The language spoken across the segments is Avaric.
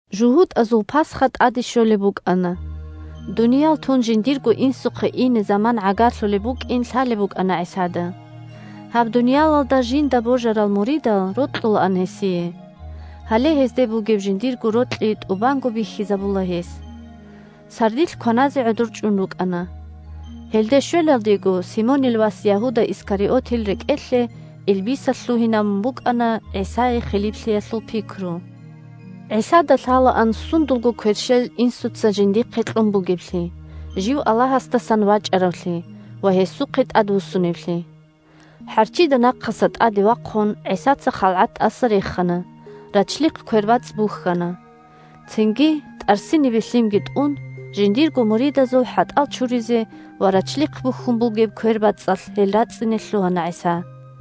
ЖугьутӀазул Пасха тӀаде щолеб букӀана. Дуниял тун жиндирго Инсухъе ине заман гӀагарлъулеб букӀин лъалеб букӀана ГӀисада. Гьаб дуниялалда жинда божарал муридал рокьулаан гьесие. Гьале гьезде бугеб жиндирго рокьи тӀубанго бихьизабула гьес. Сардилъ кваназе гӀодор чӀун рукӀана. (Гьелде щвелалдего Симонил вас Ягьуда Искариотил рекӀелъе илбисалъ лъугьинабун букӀана ГӀисае хилиплъиялъул пикру.) ГӀисада лъалаан сундулго кверщел Инсуца жиндихъе кьун бугеблъи, жив Аллагьасдасан вачӀаравлъи ва гьесухъе тӀадвуссуневлъи. ХӀарччида нахъаса тӀаде вахъун, ГӀисаца халгӀат тӀаса рехана, рачлихъ квербацӀцӀ бухьана. Цинги, тӀарсинибе лъимги тӀун, жиндирго муридазул хӀатӀал чуризе ва рачлихъ бухьун бугеб квербацӀцӀалъ гьел рацӀцӀине лъугьана ГӀиса.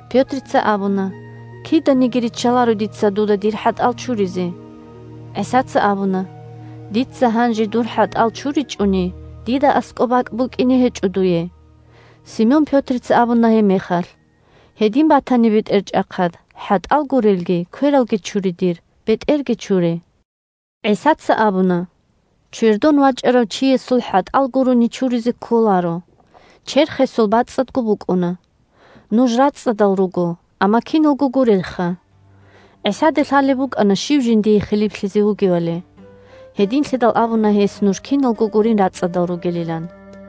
Пётрица абуна: – Киданиги риччаларо дица дуда дир хӀатӀал чуризе. ГӀисаца абуна: – Дица гьанже дур хӀатӀал чуричӀони, дида аскӀоб бакӀ букӀине гьечӀо дуе. Симон Пётрица абуна гьебмехалъ: – Гьедин батани, БетӀерчӀахъад, хӀатӀал гурелги, квералги чуре дир, бетӀерги чуре. ГӀисаца абуна: – Чвердон вачӀарав чиясул хӀатӀал гурони чуризе кколаро. Черх гьесул бацӀцӀадго букӀуна. Нуж рацӀцӀадал руго, амма киналго гурелха. ГӀисада лъалеб букӀана щив жиндие хилиплъизе вугевали. Гьединлъидал абуна гьес нуж киналго гурин рацӀцӀадал ругелилан.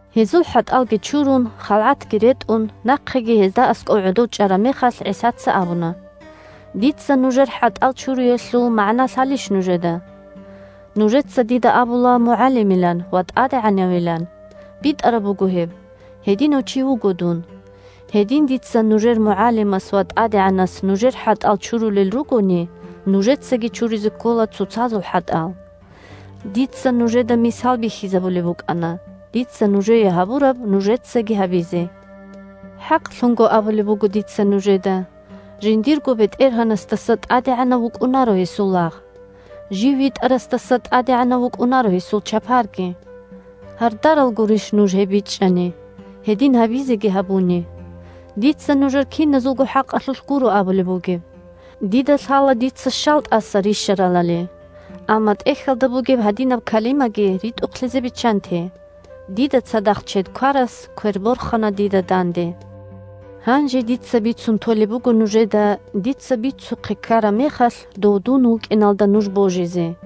Гьезул хӀатӀалги чурун, халгӀатги ретӀун, нахъеги гьезда аскӀов гӀодов чӀараб мехалъ, ГӀисаца абуна: – Дица нужер хӀатӀал чуриялъул магӀна лъалищ нужеда? Нужеца дида абула МугӀалимилан ва ТӀадегӀанавилан. БитӀараб буго гьеб. Гьединав чи вуго дун. Гьедин дица, нужер МугӀалимас ва ТӀадегӀанас, нужер хӀатӀал чурулел ругони, нужецаги чуризе ккола цоцазул хӀатӀал. Дица нужеда мисал бихьизабулеб букӀана, дица нужее гьабураб нужецаги гьабизе. ХӀакълъун абулеб буго дица нужеда: жиндирго бетӀергьанасдаса тӀадегӀанав вукӀунаро гьесул лагъ. Жив витӀарасдаса тӀадегӀанав вукӀунаро гьесул чапарги. Гьардарал гурищ нуж, гьеб бичӀчӀани, гьедин гьабизеги гьабуни! Дица нужер киназулго хӀакъалъулъ гуро абулеб бугеб. Дида лъала дица щал тӀаса рищаралали. Амма ТӀехьалда бугеб гьадинаб калимаги ритӀухълъизе биччанте: «Дида цадахъ чед кварас квер борхана дида данде». Гьанже дица бицун толеб буго нужеда, дица бицухъе ккараб мехалъ, дун Дов вукӀиналда нуж божизе.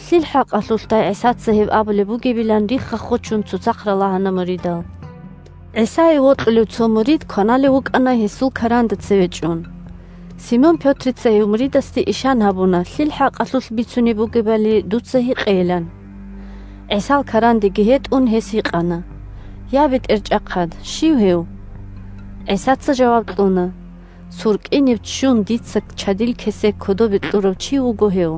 Лъил хӀакъалъулъдай ГӀисаца гьеб абулеб бугебилан рихха-хочун цоцахъ ралагьана муридал. ГӀисае вокьулев цо мурид кваналев вукӀана гьесул каранда цеве чӀун. Симон Пётрица гьев муридасде ишан гьабуна лъил хӀакъалъулъ бицунеб бугебали дуца гьикъейилан. ГӀисал карандеги гьетӀун, гьес гьикъана: – Я, БетӀерчӀахъад, щив гьев? ГӀисаца жаваб кьуна: – СуркӀиниб ччун дица чадил кесек кодобе кьурав чи вуго гьев.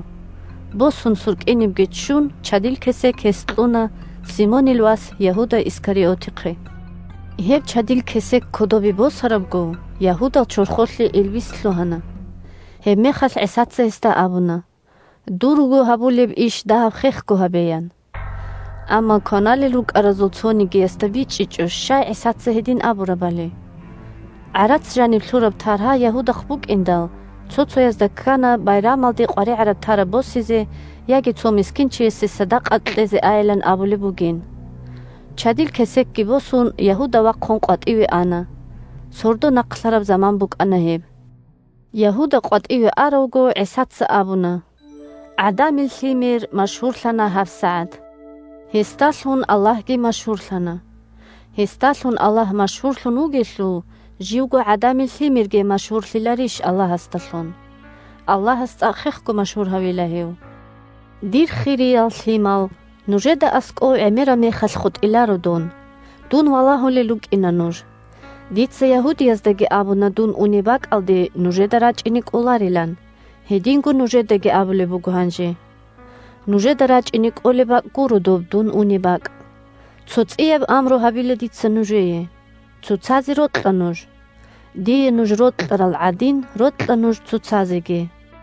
Босун, суркӀинибги ччун, чадил кесек гьес кьуна Симонил вас Ягьуда Искариотихъе. Гьеб чадил кесек кодобе босарабго, Ягьудал чорхолъе илбис лъугьана. Гьебмехалъ ГӀисаца гьесда абуна: – Дурго гьабулеб иш дагьаб хехго гьабе, – ян. Амма кваналел рукӀаразул цонигиясда бичӀчӀичӀо щай ГӀисаца гьедин абурабали. ГӀарац жаниб лъураб таргьа Ягьудахъ букӀиндал, цо-цоязда ккана байрамалде къваригӀараб-тараб босизе яги цо мискинчиясе садакъа кьезе айилан абулеб бугин. Чадил кесекги босун, Ягьуда вахъун къватӀиве ана. Сордо нахълъараб заман букӀана гьеб. Ягьуда къватӀиве аравго, ГӀисаца абуна: – ГӀадамил Лъимер машгьурлъана гьабсагӀат. Гьесдалъун Аллагьги машгьурлъана. Гьесдалъун Аллагь машгьурлъун вугелъул, живго ГӀадамил Лъимерги машгьурлъиларищ Аллагьасдалъун. Аллагьас цӀакъ хехго машгьур гьавила гьев. Дир хириял лъимал, нужеда аскӀов гӀемераб мехалъ хутӀиларо дун. Дун валагьулел рукӀина нуж. Дица ягьудияздаги абуна дун унеб бакӀалде нужеда рачӀине кӀоларилан, гьединго нужедаги абулеб буго гьанже: «Нужеда рачӀине кӀолеб бакӀ гуро доб дун унеб бакӀ». Цо цӀияб амру гьабила дица нужее: цоцазе рокьа нуж. Дие нуж рокьарал гӀадин рокьа нуж цоцазеги.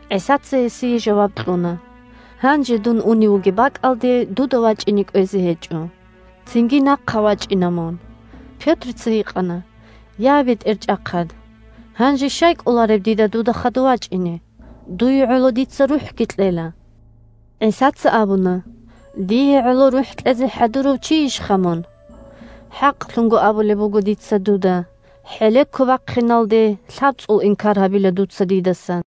ГӀисаца гьесие жаваб кьуна: – Гьанже дун унев вугеб бакӀалде дуда вачӀине кӀвезе гьечӀо. Цинги нахъа вачӀина мун. Пётрица гьикъана: – Я, БетӀерчӀахъад, гьанже щай кӀолареб дида дуда хадув вачӀине? Дуе гӀоло дица рухӀги кьела. ГӀисаца абуна: – Дие гӀоло рухӀ кьезе хӀадурав чийищха мун? ХӀакълъун абулеб буго дица дуда: хӀелеко бахъиналде лъабцӀул инкар гьабила дуца дидаса.